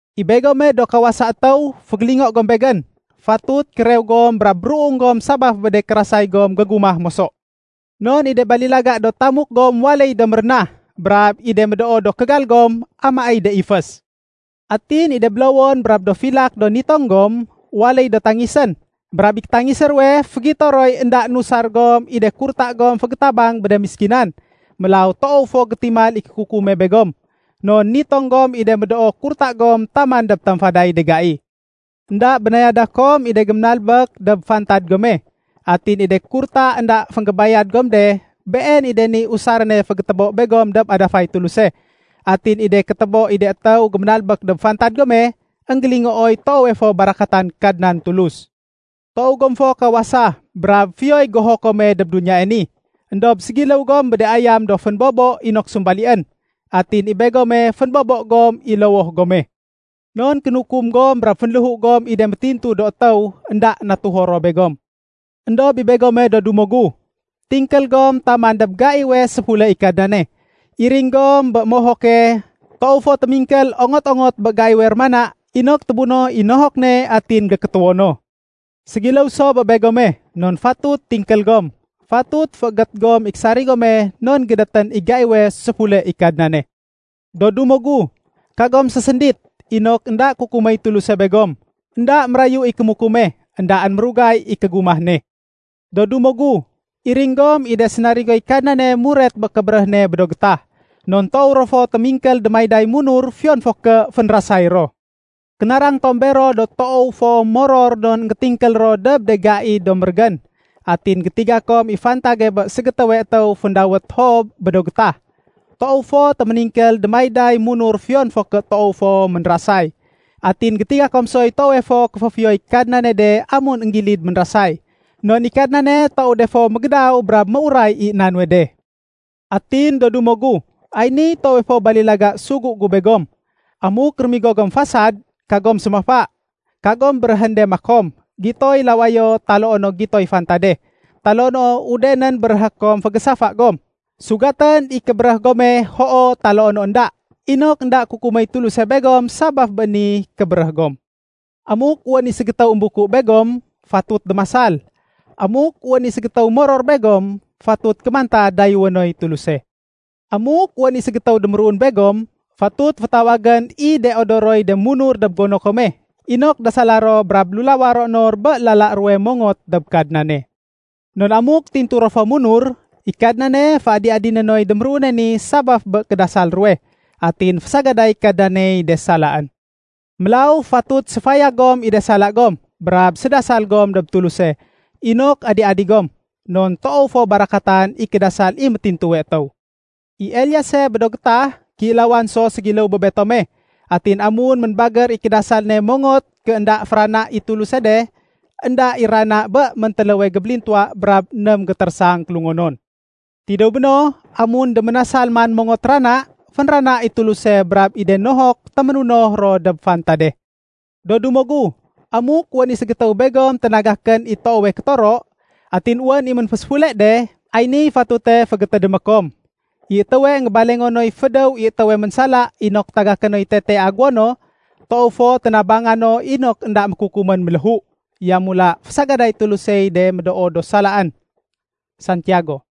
I begome do kawasa étéw, fégélingo gom begén. Fatut kérew gom brab ruung gom sabaf bé de kérasay gom gégumah moso. Non i de balilaga do tamuk gom waléy do mérénah. Brab i de médoo do kégal gom amaéy de ifés. Atin i de bélowon brab do filak do nitong gom, waléy do tangisén. Brab i kétangisé ruwe fégito roy énda nusar gom i de kurta gom fégétabang bé de méskinan. Mélaw toow fo gétimal i kékukume begom. Non nitong gom i de médoo kurta gom taman dob tamfaday de gai. Enda bénayada kom i de géménalbék dob fantad gome. Atin i de kurta énda fénggébayad gom de, been i de niy usaréne fégétébo begom dob adafay Tuluse. Atin i de kétébo i de étéw géménalbék dob fantad gome, énggélingooy toowe fo barakatan Kadnan Tulus. Toow gom fo kawasa brab fiyoy goho kome dob duniyae ni. Endob ségiléw gom bé de ayam do fénbobo inok sumbalién. Atin i begome fénbobo gom i lowoh gome. Non kénukum gom brab fénléhu gom i de métintu do étéw énda natuho ro begom. Endob i begome do dumo gu, tingkél gom taman dob gaiwe séfule i Kadnane. Iring gom bé mohoke toow fo témingkél ongot-ongot bé gaiwe rémana inok témunoh i nohok ne atin gékétéwo no. Ségiléw so bé begome non fatut tingkél gom. Fatut féégét gom i késarig gome non gédétén i gaiwe séfule i Kadnane. Do dumo gu, kagom séséndit, inok énda kukuméy Tuluse begom. Enda mérayu i kémukume, éndaén mérugay i kégumah ne. Do dumo gu, iring gom i de sénarigoy Kadnane muret bé kébéréh ne bé do gétah, non toow ro fo témingkél démayday munur fiyon fo ké fénrasay ro. Kénarang tom bero do toow fo moror non énggétingkél ro dob de gai do mérégén. Atin gétiga kom i fantage bé ségétéwe étéw féndawét Job bé do gétah. Toow fo téméningkél démayday munur fiyon fo ké toow fo ménrasay. Atin gétiga kom soy toowe fo kéféfiyoy Kadnane de amun énggilid ménrasay. Non i Kadnane toow de fo mégédaw brab méuray i na nuwe de. Atin do dumo gu, ay niy toowe fo balilaga sugu gu begom. Amuk rémigo gom fasad, kagom sémafa. Kagom béréhén de makom, “Gitoy lawayo” taloo no “Gitoy fantade”, taloo no udenén béréhé kom fégésafa gom. Sugatén i kébéréh gome, “Hoo” taloo no “Enda”, inok énda kukuméy Tuluse begom sabaf bé ni kébéréh gom. Amuk wén i ségétéw émbuku begom, fatut démasal. Amuk wén i ségétéw moror begom, fatut kémanta dayéwé noy Tuluse. Amuk wén i ségétéw déméruun begom, fatut fétawagén i de odoroy de munur dob gono kome, inok dasala ro brab lulawa ro nor bé lala ruwe mongot dob Kadnane. Non amuk tintu ro fo munur, i Kadnane féadi-adiné noy déméruune ni sabaf bé kédasal ruwe. Atin fésagaday Kadnaney de salaén. Mélaw, fatut séfayag gom i de sala gom, brab sédasal gom dob Tuluse, inok adi-adi gom. Non toow fo barakatan i kédasal i métintuwe étéw. I Eliase bé do gétah, kéilawan so ségiléw bé betome. Atin amun ménbagér i kédasal ne mongot ké énda férana i Tuluse de, énda i rana bé méntéléwe gébélintuwa brab ném gétérésang kélungonon. Tidéw béno, amun déménasal man mongot rana, fénrana i Tuluse brab i de nohok téménunoh ro dob fantade. Do dumo gu, amuk wén i ségétéw begom ténagakén i toowe kétoro, atin wén i ménféséfule de, ay niy fatute fégétédémé kom: I étéwe énggébalengo noy fédéw i étéwe ménsala inok tagaké noy tetee aguwo no, toow fo ténabanga no inok énda mékukumén méléhu. Yamula fésagaday Tulusey de médoo do salaén. Santiago